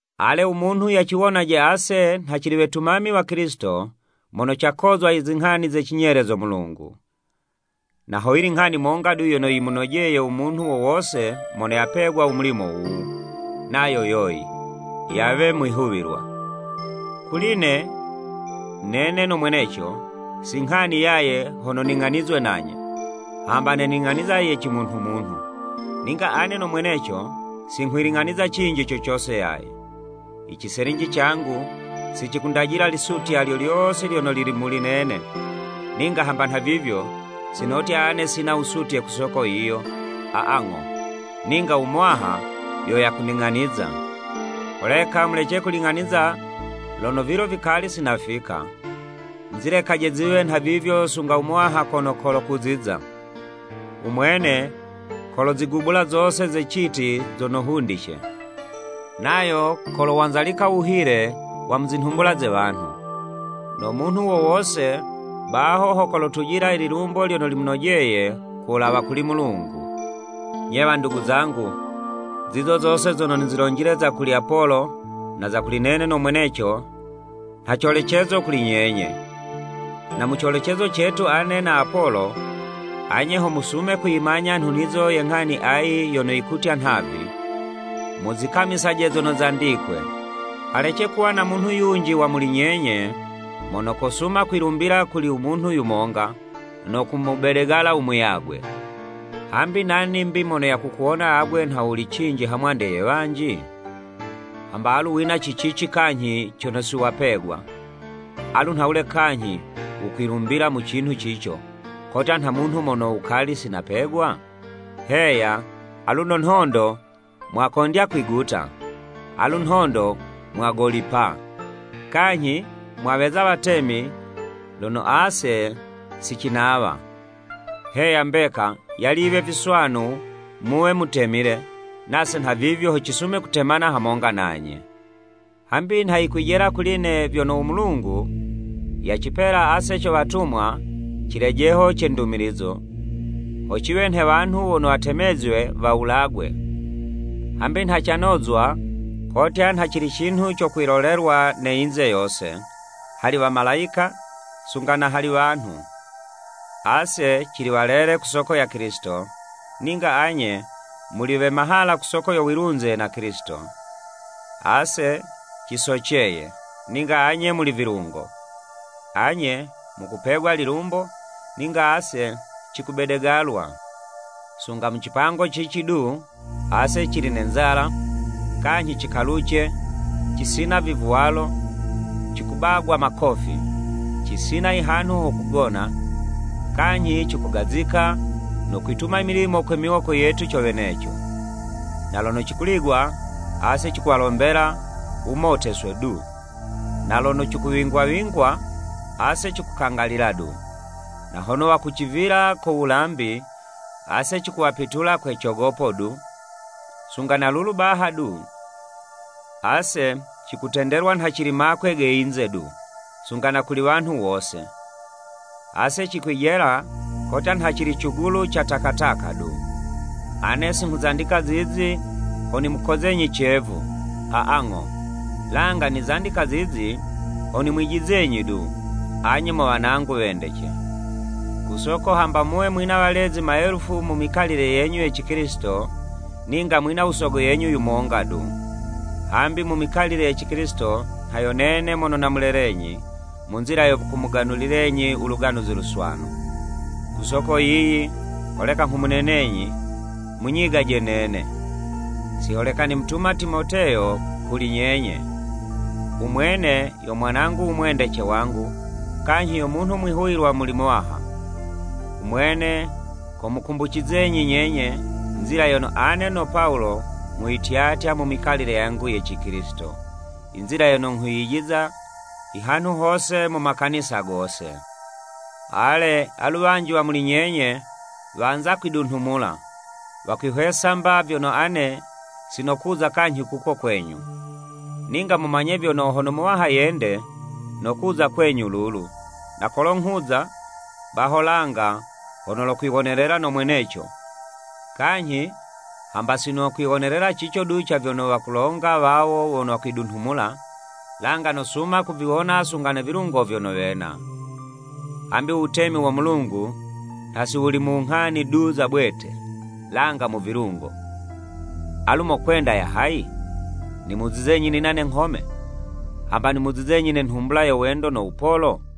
Ale, u munhu yaciwonaje ase nha cili wetumami wa Kilisito mono cakozwa i zinghani ze cinyele zo Mulungu. Na hoyili nghani monga du yono yimunojeye u munhu wo wose mono yapegwa u mulimo wuwu, nayo yoyi, yawe mwihuwilwa. Kuli'ne, nene no mweneco, si nghani yaye hono ning'anizwe nanye, hamba ne ning'aniza ye cimunhumunhu, ninga ane no mweneco, si nghwiling'aniza cinji co cose yaye. I ciselinji cangu, si cikundajila lisutya lyo lyose lyono lili muli nene, ninga hamba nhavivyo, si notya ane sina wusutye ku soko yiyo, aa ng'o. Ninga u Muwaha yo yakuning'aniza. Holeka mulece kuling'aniza lono vilo vikali si nafika, muzilekaje ziwe nhavivyo sunga u Muwaha kono kolo kuziza. U Mwene kolozigubula zose ze citi zono hundice, nayo kolowanzalika u wuhile wa mu zinhumbula ze wanhu. No munhu wo wose, baho ho kolotujila ililumbo lyono limunojeye, ku wulawa kuli Mulungu. Nye, wandugu zangu, zizo zose zono nizilonjile za kuli Apolo, na za kuli nene no mweneco, nha colecezo kuli nyenye. Na mu colecezo cetu ane na Apolo, anye ho musume kuyimanya nhunizo ye nghani ayi yono yikutya nhavi, “Muzikamisaje zono zandikwe.” Halece kuwa na munhu yunji wa muli nyenye, mono kosuma kwilumbila kuli u munhu yumonga, no kumubedegala umuyagwe. Hambi nani 'mbi mono yakukuwona agwe nha wuli cinji ha mwande ye wanji? Hamba alu wina ci cici kanyhi cono siwapegwa, alu nhawule kanyhi wukwilumbilila mu cinhu cico, kotya nha munhu mono wukali si napegwa? Heya, aluno nhondo mwakondya kwiguta! Alu nhondo mwagolipa! Kanyhi mwaweza watemi lono ase si cinawa! Heya mbeka, yali yiwe viswanu muwe mutemile, nase nhavivyo ho cisume kutemana hamonga nanye. Hambi nha yikwijela kuli'ne vyono u Mulungu yacipela ase co watumwa cilejeho ce ndumilizo, ho ciwe nhe wanhu wono watemezwe wawulagwe, hambi nha canozwa kotya nha cili cinhu co kwilolelwa ne yinze yose, hali wamalayika, sunga na hali wanhu. Ase cili walele ku soko ya Kilisito, ninga anye muli we mahala ku soko yo wilunze na Kilisito! Ase cisoceye, ninga anye muli vilungo. Anye mukupegwa lilumbo, ninga ase cikubedegalwa. Sunga mu cipango cici du, ase cili ne nzala, kanyhi cikaluce, cisina vivwalo, cikubagwa makofi, cisina ihanhu ho kugona. Kanyhi cikugazika, no kwituma imilimo kwe miwoko yetu co weneco. Na lono cikuligwa, ase cikuwalombela wumoteswe du, na lono cikuwingwa wingwa, ase cikukangalila du, na hono wakucivila ko wulambi, ase cikuwapitula kwe cogopo du. Sunga na lulu baha du, ase cikutendelwa nha cili makwe ge yinze du, sunga na kuli wanhu wose, ase cikwijela kotya nha cili cugulu ca takataka du! Ane si nghuzandika zizi, ho nimukozenyi cevu, aa ng'o, langa nizandika zizi, ho nimwijizenyi du, anye mo wanangu wendece. Ku soko, hamba muwe mwina walezi maelufu mu mikalile yenyu ye Cikilisito, ninga mwina u sogo yenyu yumonga du, hambi mu mikalile ye Cikilisito, nha yo nene mono namulelenyi, mu nzila yo kumuganulilenyi u Luganuzi Luswanu. Ku soko yiyi, holeka nghumunenenyi, munyigaje nene. Si holeka nimutuma Timoteyo kuli nyenye. U mwene, yo mwanangu u mwendece wangu, kanyhi yo munhu mwihuwilwa muli Muwaha. U mwene, komukumbucizenyi nyenye, nzila yono ane no Pawulo nghuyityatya mu mikalile yangu ye Cikilisito, i nzila yono nghuyijiza ihanhu hose mu makanisa gose. Ale, alu wanji wa muli nyenye, wanza kwidunhumula, wakwihwesa mba vyono ane sinokuza kanyhi kuko kwenyu. Ninga mumanye vyono, hono u Muwaha yende, nokuza kwenyu lulu, na kolo nghuza, baho langa, ho nolokwiwonelela no mweneco, kanyhi hamba si nokwiwonelela cico du ca vyono, wakulonga wawo wono wakwidunhumula, langa nosuma kuviwona sunga ne vilungo vyono wena. Hambi u wutemi wo Mulungu, nha si wuli mu nghani du za bwete, langa mu vilungo. Alu mokwenda ya hayi? Nimuzizenyi nina ne nghome, hamba nimuzizenyi ne nhumbula yo wendo no wupolo?